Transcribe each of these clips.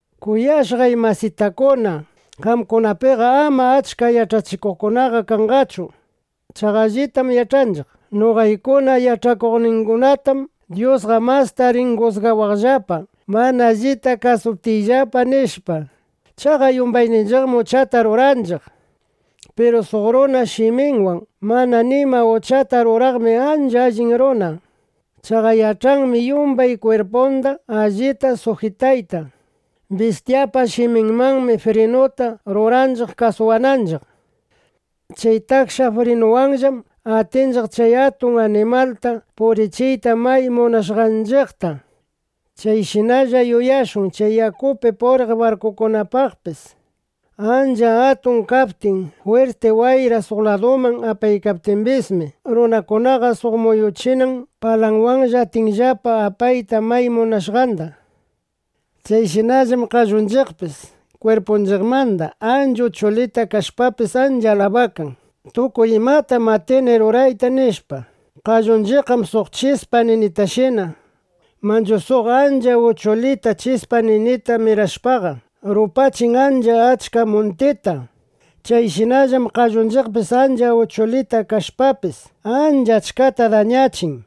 Kuyashqay masitakuna, qamkunapiqa ama achka yach'achikuqkuna kanqachu. Chaqa allitam yach'anchiq: Noqaykuna yach'achikuqkunatam Dyusqa masta rin jusgawaqllapa, mana allita kawsaptiyllapa, nishpa. Chaqa yumbayninchiqmi uchata ruranchiq. Piru suq runa shiminwan mana nima uchata ruraqmi ancha allin runa. Chaqa yach'anmi yumbay kwirpunda allita sujitayta. Bistyapa shiminmanmi frinuta ruranchiq kasuwananchiq. Chay taksha frinuwanllam atinchiq chay atun animalta purichiyta may munashqanchiqta. Chayshinalla yuyashun chay yakupi puriq barkukunapaqpis. Ancha atun kaptin, jwirti wayra suq laduman apaykaptimbismi, runakunaqa suq muyuchinan palawanlla atinllapa apayta may munashqanda. Chayshinallam qallunchiqpis kwirpunchiqmanda ancha uchulita kashpapis, ancha alabakan: “Tukuy imatam atini rurayta”, nishpa. ¡Qallunchiqqam suq chispa ninitashina! Manchu suq ancha uchulita chispa ninita mirashpaqa, rupachin ancha achka muntita. Chayshinallam qallunchiqpis ancha uchulita kashpapis, ancha achkata dañachin.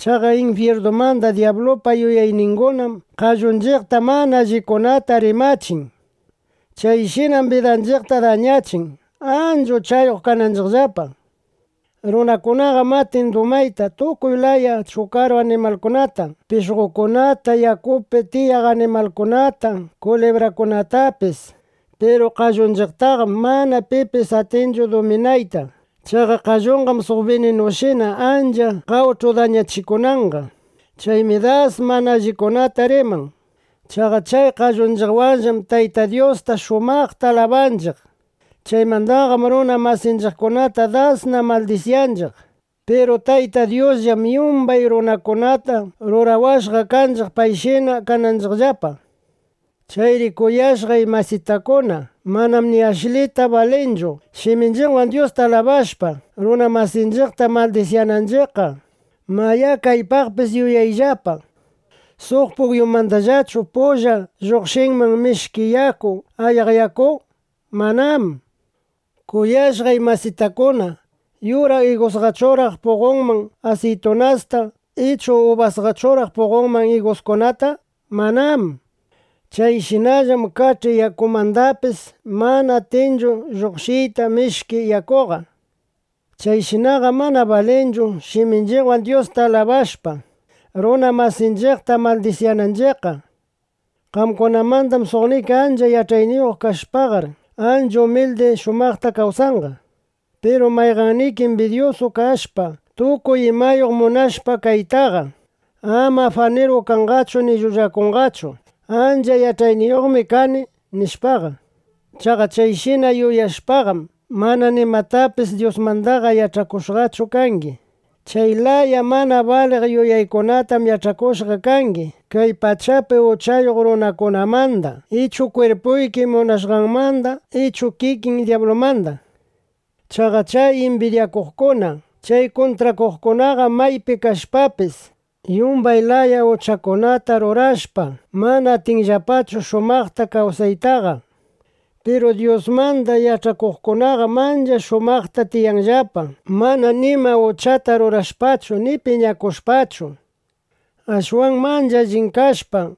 Chaqa infyirnumanda dyablupa yuyayningunam qallunchiqta mana allikunata rimachin. Chayshinam bidanchiqta dañachin, ancha uchayuq kananchiqllapa. Runakunaqam atin dumayta tukuy laya chukaru animalkunata, pishqokunata, yakupi tiyaq animalkunata, kulibrakunatapis. Piru qallunchiqtaqam mana pipis atinchu duminayta. Chaqa qalluqam suq bininushina ancha qawch'u dañachikunanqa. Chaymi das mana allikunata riman. Chaqa chay qallunchiqwanllam Tayta Dyusta shumaqta alabanchiq. Chaymandaqam runa masinchiqkunata dasna maldisyanchiq. Piru Tayta Dyusqam yumbay runakunata rurawashqa kanchiq, payshina kananchiqllapa. Chayri kuyashqay masitakuna, manam ni ashlita balinchu, shiminchiqwan Dyusta alabashpa, runa masinchiqta maldisyananchiqqa. Mayá, kaypaqpis yuyashunllapa: ¿Suq pukyumandallachu pulla lluqshinman mishki yaku, ayaq yaku? Manám. Kuyashqay masitakuna, ¿yura igusqachuraq puqonman asiytunasta ichu ubasqachuraq puqonman iguskunata? ¡Manám! Chayshinallam kach'i yakumandapis mana atinchu lluqshiyta mishki yakuqa. (Chayshinaqam mana balinchu shiminchiqwan Dyusta alabashpa, runa masinchiqta maldisyananchiqqa.) Qamkunamanda suqniki ancha yach'ayniyuq kashpaqar, ancha umildi shumaqta kawsanqa. Piru mayqanniki imbidyusu kashpa, tukuy imayuq munashpa kaytaqa, ama afaniru kanqachu ni llullakunqachu: “Ancha yach'ayniyuqmi kani”, nishpaqa. Chaqa chayshina yuyashpaqam, mana nimatapis Dyusmandaqa yach'akushqachu kangi. Chay laya mana baliq yuyaykunatam yach'akushqa kangi kay pachapi uchayuq runakunamanda ichu kwirpuyki munashqanmanda ichu kikin dyablumanda. Chaqa chay imbidyakuqkuna, chay kuntrakuqkunaqam maypi kashpapis, yumbay laya uchakunata rurashpa, mana atinllapachu shumaqta kawsaytaqa. Piru Dyusmanda yach'akuqkunaqam ancha shumaqta tiyanllapa, mana nima uchata rurashpachu, ni piñakushpachu. Ashwanmi ancha allin kashpa,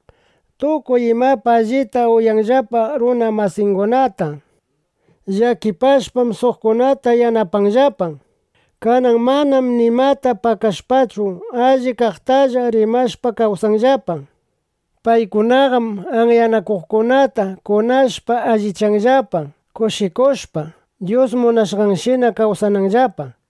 tukuy imapi allita uyanllapa runa masingunata. Llakipashpam, suqkunata yanapanllapa. Kanan manam nimata pakashpachu, allip kaqtalla rimashpa kawsanllapa. Paykunaqam anyanakuqkunata kunashpa alliyachinllapa, kushikushpa, Dyus munashqanshina kawsananllapa.